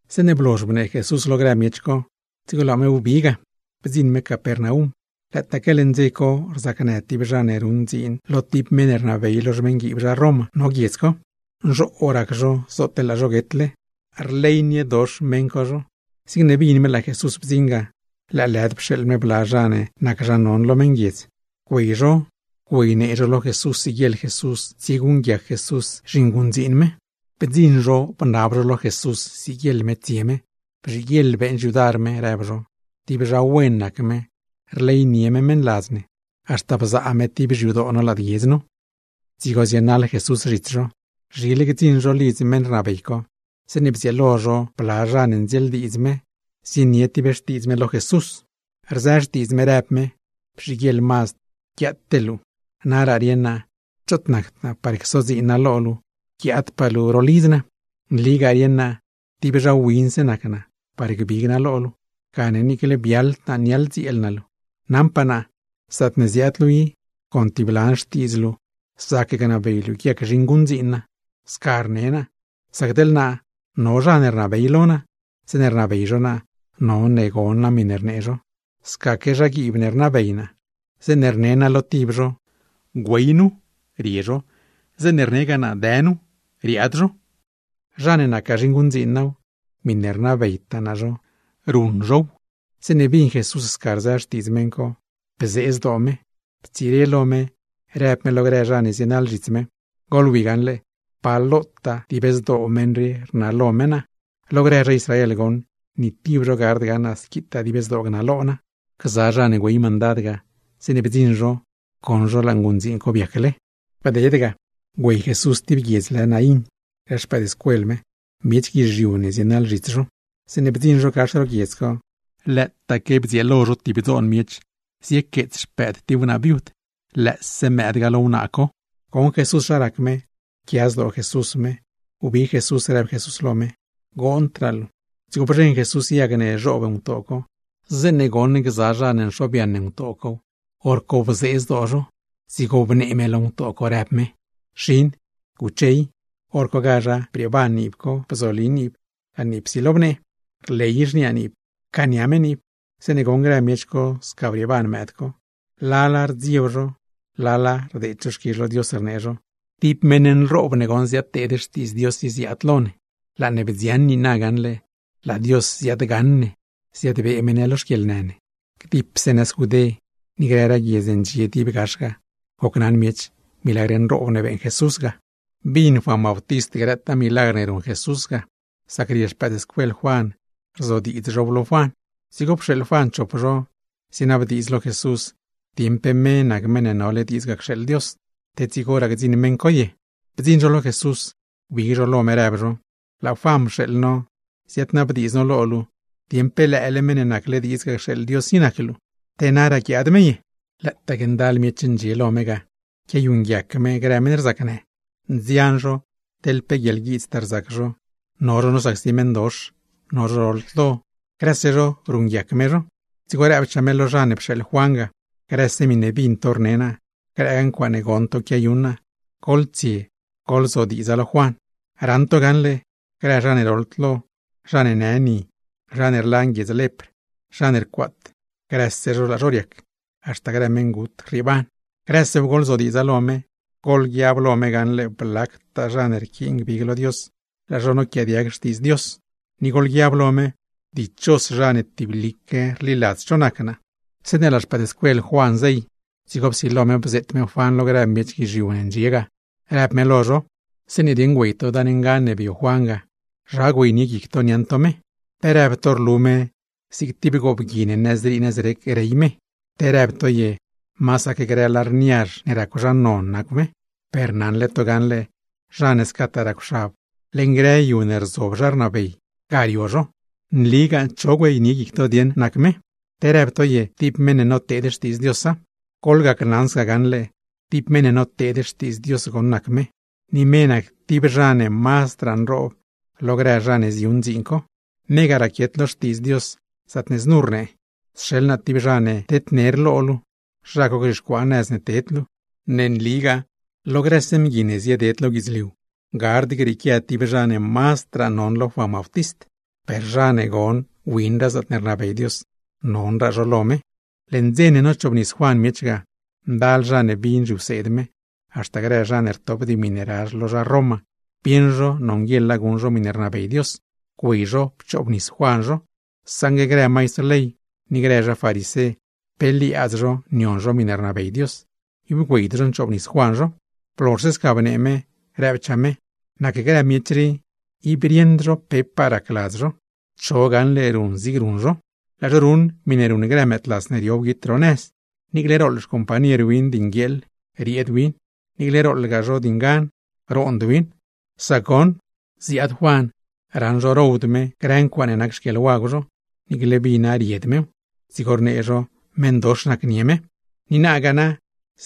Zeeṉe blozh bnee Jesús lo grë miech co, dzigo laa me wbi ga, bdziṉ me Capernaum. Lëëtaaque leṉ dze co rzacnë tib zha ne ruṉ dziin lo tib meṉ ne rnabey lo xmeṉguiib zha Roma, no guiedz co; nzhoo rac zho zootle laa zho guetle. Rleyniedox meṉ co zho, zigne bin me laa Jesús bdziṉ, lëëlëd pxeeḻ me bla zha ne nac zha non lo meṉguiedz Israel, güey zho güeynee zho lo Jesús siguieḻ Jesús tsieguṉguiac Jesús zhinguṉdziin me. Bdziṉ zho bnab zho lo Jesús siguieḻ me tsie me. ―Bzhiguieḻ beeṉ xyudar me ―rëb zho―. Tib zha wen nac me, rleynie me meṉladz ne, haxta bzaa me tib xyadoo no lad guiedz nu. Dzigo zienaḻ Jesús zhits zho. Zhile gdziṉ zho lidz meṉ rnabey co, zeeṉe bdzieelo zho bla zha ne ndzieeldiidz me, zienie tib xtiidz me lo Jesús. Rzë xtiidz me, rëb me: ―Bzhiguieḻ mazd guiaate luu. Naraa rieṉ naa choot nacd naa, par csodziin naa lo luu guiaad luu haxta ro lidz naa. Nligaa rieṉ naa tib zha winse nac naa par gbig naa lo luu, gane niicle biaḻd naa niaḻdzieel naa luu. Naṉpaa naa, zaatne ziaad luu i, con tib lan xtiidz luu zac gnabey luu guiac zhinguṉdziin naa. Sca rnee naa, sac teḻ naa no zha ne rnabey lo naa, zeeṉe rnabey zho naa none gon naa miṉe rnee zho; scaque zhaguiib ne rnabey naa, zeeṉe rne naa tib lo zho: “Güey nu”, rie zho; zeeṉe rnegaa naa: “Dë nu”, riaad zho; zha ne nacgaa zhinguṉdziin naaw, miṉe rnabeytaa naa zho, ruṉ zhow. Zeeṉe bin Jesús sca rzë xtiidz meṉ co, bzee zdoo me, ptsire lo me, rëb me lo grë zha ne zienaḻ zhits me: ―Goḻwi gaṉle pa lotaa rnalo meṉ qui Dios. Lo grë zha Israel goṉ, ni tib zho gard gaṉ naa squitaa dib zdoo gnalo Dios. Grë zha ne güey mandad ga, zeeṉe bdziṉ zho goṉ zho laa nguṉdziin co biacle. Bded ga, güey Jesús tib guiedz lë Naín grë xpëëdscuel me, miech guizhiu ne zienaḻ zhits zho. Zeeṉe bdziṉ zho gax ro guiedz co, lëëtaque bdzieelo zho tib dzoon miech ziequeets xpëëd tib wnaa viud; lëëse mëëd ga lo wnaa co. Goṉ Jesús zha rac me, pquia zdoo Jesús me, wbig Jesús rëb Jesús lo me: ―¡Goondraa luu! Dzigo bzheṉ Jesús yag ne zhoob ngutoo co. Zeeṉe goṉ gza zha ne nxobyaṉ yag cow, hor co bzodze zho; dzigo bnee me lo mëëd co rëb me: ―Xin, ¡guche i! Horcogazha brieeban niib co, bzobli niib, laa niib psilo bnee. Rley xniaa niib, pcaania me niib. Zeeṉe goṉ grë miech co sca brieeban mëëd co, lala rdzieb zho, lala rdeed zho xquizh lo Dios, rnee zho: ―¡Tib meṉ nroob ne goṉ ziadteed xtiidz Dios i, ziaad lo ne! ¡Laa ne bdziaṉ niina gaṉle, laa Dios ziaadgaṉ ne, ziadbee me ne lo xquieḻnë ne! Gdipse nëz Judé, ni grëraa guiedz ne ndxie dib gax ga, gocnaṉ miech milagr nroob ne beeṉ Jesús ga. Bin Juan Bautist grëtaa milagr ne ruṉ Jesús ga, sac rie xpëëdscuel Juan riezodiidz zhow lo Juan. Dzigo pxeeḻ Juan chop zho, zienabdiidz lo Jesús, dieṉ pe me nac Meṉ ne nole diidz ga cxeeḻ Dios, te dzigoraa gdziṉ meṉ co ye. Bdziṉ zho lo Jesús, wbig zho lo me, rëb zho: ―Laa Juan pxeeḻ no ziaadnabdiidz no lo luu, dieṉ pe lëële Meṉ ne nacle diidz ga cxeeḻ Dios i nac luu, te naraa guiaad me ye. Lëëtaaque ndal miech ndxie lo me ga, quiayuṉguiac me grë meṉ rzacnë. Nzian zho, teḻ pe guieḻguiidztaa rzac zho, no zho nosacsi meṉdox, no zho roḻd lo, grëse zho ruṉguiac me zho. Dzigo rëbchaa me lo zha ne pxeeḻ Juan ga: ―Grëse miṉe bin to rne naa, grëgaa ncuaaṉe goṉ to quiayuṉ naa, goḻtsie goḻzodiidza lo Juan. Raṉ to gaṉle, grë zha ne roḻd lo, zha ne në ni, zha ne rlan guiedz lepr, zha ne rcuaat, grëse zho laa zho riac, haxta grë meṉgut, rrieeban. Grësew goḻzodiidza lo me, goḻguiab lo me gaṉle blactaa zha ne rquiin gbig lo Dios, laa zho noquiaadiag xtiidz Dios; ni goḻguiab lo me: dichos zha ne tiblique rliladz cho nac naa. Zeeṉe laa xpëëdscuel Juan zey, dzigo psilo me bzeet me Juan lo grë miech guizhiu ne ndxie ga, rëb me lo zho: ―Zeeṉe dieṉ güey to dan ngan ne bio Juan ga, ¿zha güeynie guic to niaṉ to me? ¿Pe rëb to rlu me zig tib goobgui ne nëzrii nëzrec rey me, te rëb to ye masaque grë lar niazh ne racw zha non nacw me? Per naṉle to gaṉle, zha ne scataa racwxab, leṉ grë yu ne rzob zha rnabey, ga rio zho. Nligaa cho güeynie guic to nac me, ¿te rëb to ye tib meṉ ne noteed xtiidz Diosa? ’Gacnaṉ to gaṉle, tib meṉ ne noteed xtiidz Dios goṉ nac me, ni me nac tib zha ne mazdraa nroob lo grë zha ne ziyuṉ dziin co. Me ga raquiet lo Xtiidz Dios, zaatne znu rnee: “Sxeḻ naa tib zha ne tednerga lo luu, zha co gzhixcuaa nëz ne ted luu.” Ne nligaa lo grëse mgui ne zieded lo guidzliu, gard grieequia tib zha ne mazdraa non lo Juan Bautist; per zha ne goṉ winraa zaatne rnabey Dios, nonraa zha co lo me. Leṉ dze ne nochoobnis Juan miech ga, ndal zha ne bin zhiwseed me, haxta grë zha ne rtop dimi ne razh lo zha Roma, bieṉ zho nonguieḻa guṉ zho miṉe rnabey Dios, güey zho pchoobnis Juan zho. Saṉgue grë maistr ley ni grë zha farisé, pe liaadz zho nion zho miṉe rnabey Dios, ib güeyd zho nchoobnis Juan zho. Blozhse sca bnee me, rëbchaa me: ―Nac grë miech rii, ib rieṉd zho pepaa racladz zho. ¿Cho gaṉle ruṉ zigne ruṉ zho? Lëë zho ruṉ miṉe ruṉ grë mëëdlas ne rio wguit dib ro nëz. Niicle rooḻ xcompañer win di nguieeḻ, rieed win; niicle rooḻgaa zho di ngan, roond win. Sac goṉ, ziaad Juan, raṉ zho rowd me grë ncuaaṉe nac xquieḻwagw zho, niicle vina ried mew; dzigo rnee zho meṉdox nacnie me. Blozh ga,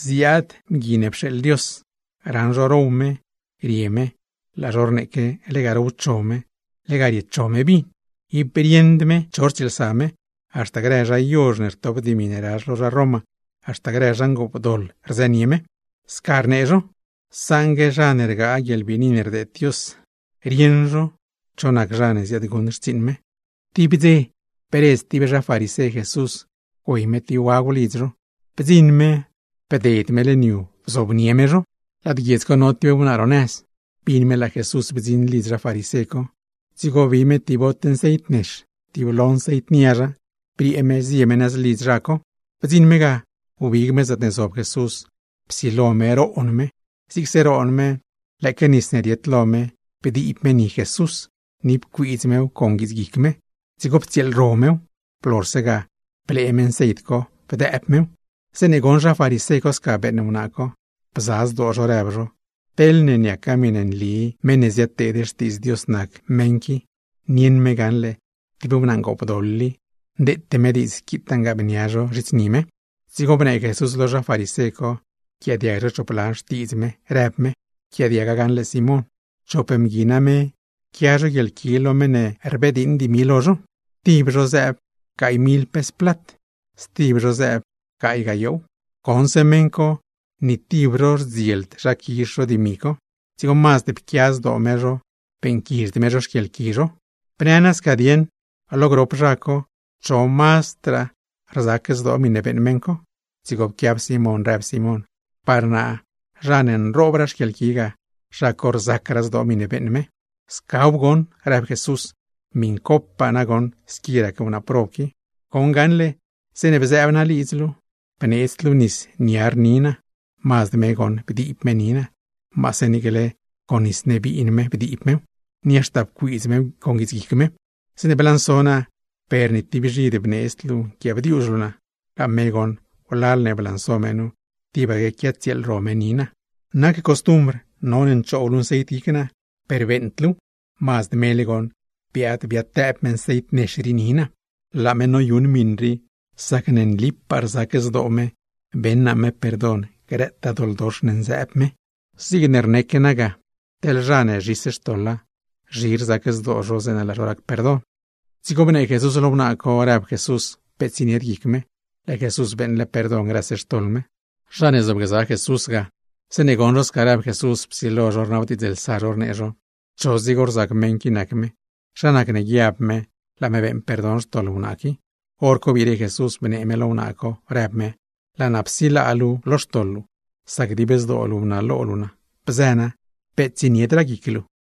ziaad Mgui ne pxeeḻ Dios, raṉ zho row me, rie me, laa zho rneeque lega rowcho me, lega riecho me vin; ib rieṉd me cho rtsieelsa me, haxta grë zha yozh ne rtop dimi ne razh lo zha Roma, haxta grë zha ngoopdoḻ rzënie me. Sca rnee zho, saṉgue zha ne rgaa guieḻbiini ne rdeed Dios, rieṉ zho cho nac zha ne ziaadguṉ xtsiiṉ me. Tib dze bredz tib zha farisé Jesús güey me tib wagw lidz zho. Bdziṉ me, bded me bzob me lo mezh. Lad guiedz co no tib wnaa ro nëz, bin me laa Jesús bdziṉ lidz zha farisé co, dzigo bi me tib bot nceit nex, tiblo nceit niazha, briee me zie me nëz lidz zha co. Bdziṉ me ga, wbig me zaatne zob Jesús, psilo me roon me. Zigse roon me, lëëque nis ne riet lo me ga, bdiib me ni Jesús, ni pcuiidz mew con guits guic me. Dzigo ptsieelro mew, blozhse ga blee me nceit co bdëëb mew. Zeeṉe goṉ zha farisé co sca beeṉ wnaa co, bza zdoo zho rëb zho: “Teḻne niaca miṉe nli meṉ ne ziadteed xtiidz Dios nac meṉ qui, nieṉ me gaṉle tib wnaa ngoopdoḻ i, ndeete me diidz squitaa nguëëbnia zho zhits ni me.” Dzigo bnee Jesús lo zha farisé co yquiaadiag zho chop lan xtiidz me, rëb me: ―Pquiaadiaga gaṉle Simón: Chop mgui name, quia zho guieḻqui lo meṉ ne blediiṉ dimi lo zho. Tib zho zëëb gaay mil pes plat, stib zho zëëb gaay gayoow. Goṉse meṉ co ni tib zho rdzield zha quizh zho dimi co, dzigo mazd pquia zdoo me zho, beeṉquizhd me zho xquieḻqui zho. Bnë nasca dieṉ, lo grop zha co, ¿cho mazdraa sac zdoo miṉe beeṉ meṉ co? Dzigo pquiab Simón, rëb Simón: ―Par naa, zha ne nroobraa xquieḻqui ga, zha co sacraa zdoo miṉe beeṉ me. ―Scaw goṉ ―rëb Jesús―. ¡Miṉcopaa nagoṉ squi rac wnaa prob qui! Goṉ gaṉle zeeṉe bzëëb naa lidz luu, bneedzd luu nis niar ni naa; mazd me goṉ bdiib me ni naa, maase niicle con nis ne biin me bdiib mew, ni haxta pcuiidz mew con guits guic me. Zeeṉe blanso naa per ni tib bzhid bneedzd luu nquiaabdiuzh luu naa, laa me goṉ wlal ne blanso me nu tibaque quiatsieelro me ni naa. Nac costumbr none nchoob luu nceit guic naa, per beeṉd luuw; mazd mele goṉ biaad biadtëëb me nceit nex rii zhits ni naa. Laa me noyuṉ miṉ rii, sacne nlipaa rzac zdoo me beṉ naa me perdon grëtaa doḻdox ne nzëëb me. Zigne rneeque ne ga, teḻ zha ne zhis xtoḻa, zhi rzac zdoo zho zeeṉe laa zho rac perdon. Dzigo bnee Jesús lo wnaa co, rëb Jesús peet tsienied guic me, laa Jesús beeṉle perdon grëse xtoḻ me. Zha ne zobgza Jesús lo mezh ga, zeeṉe goṉ zho sca rëb Jesús psilo zho rnabdiidzlsa zho, rnee zho: ―¿Cho dzigo rzac mgui qui nac me? ¿Zha nacne guiab me laa me beeṉ perdon xtoḻ wnaa qui? Horco biire Jesús bnee me lo wnaa co, rëb me: ―Laa naa psilaa luu lo xtoḻ luu, sac dib zdoo luu bnalo luu naa. Bzë naa, peet tsieniedraa guic luu.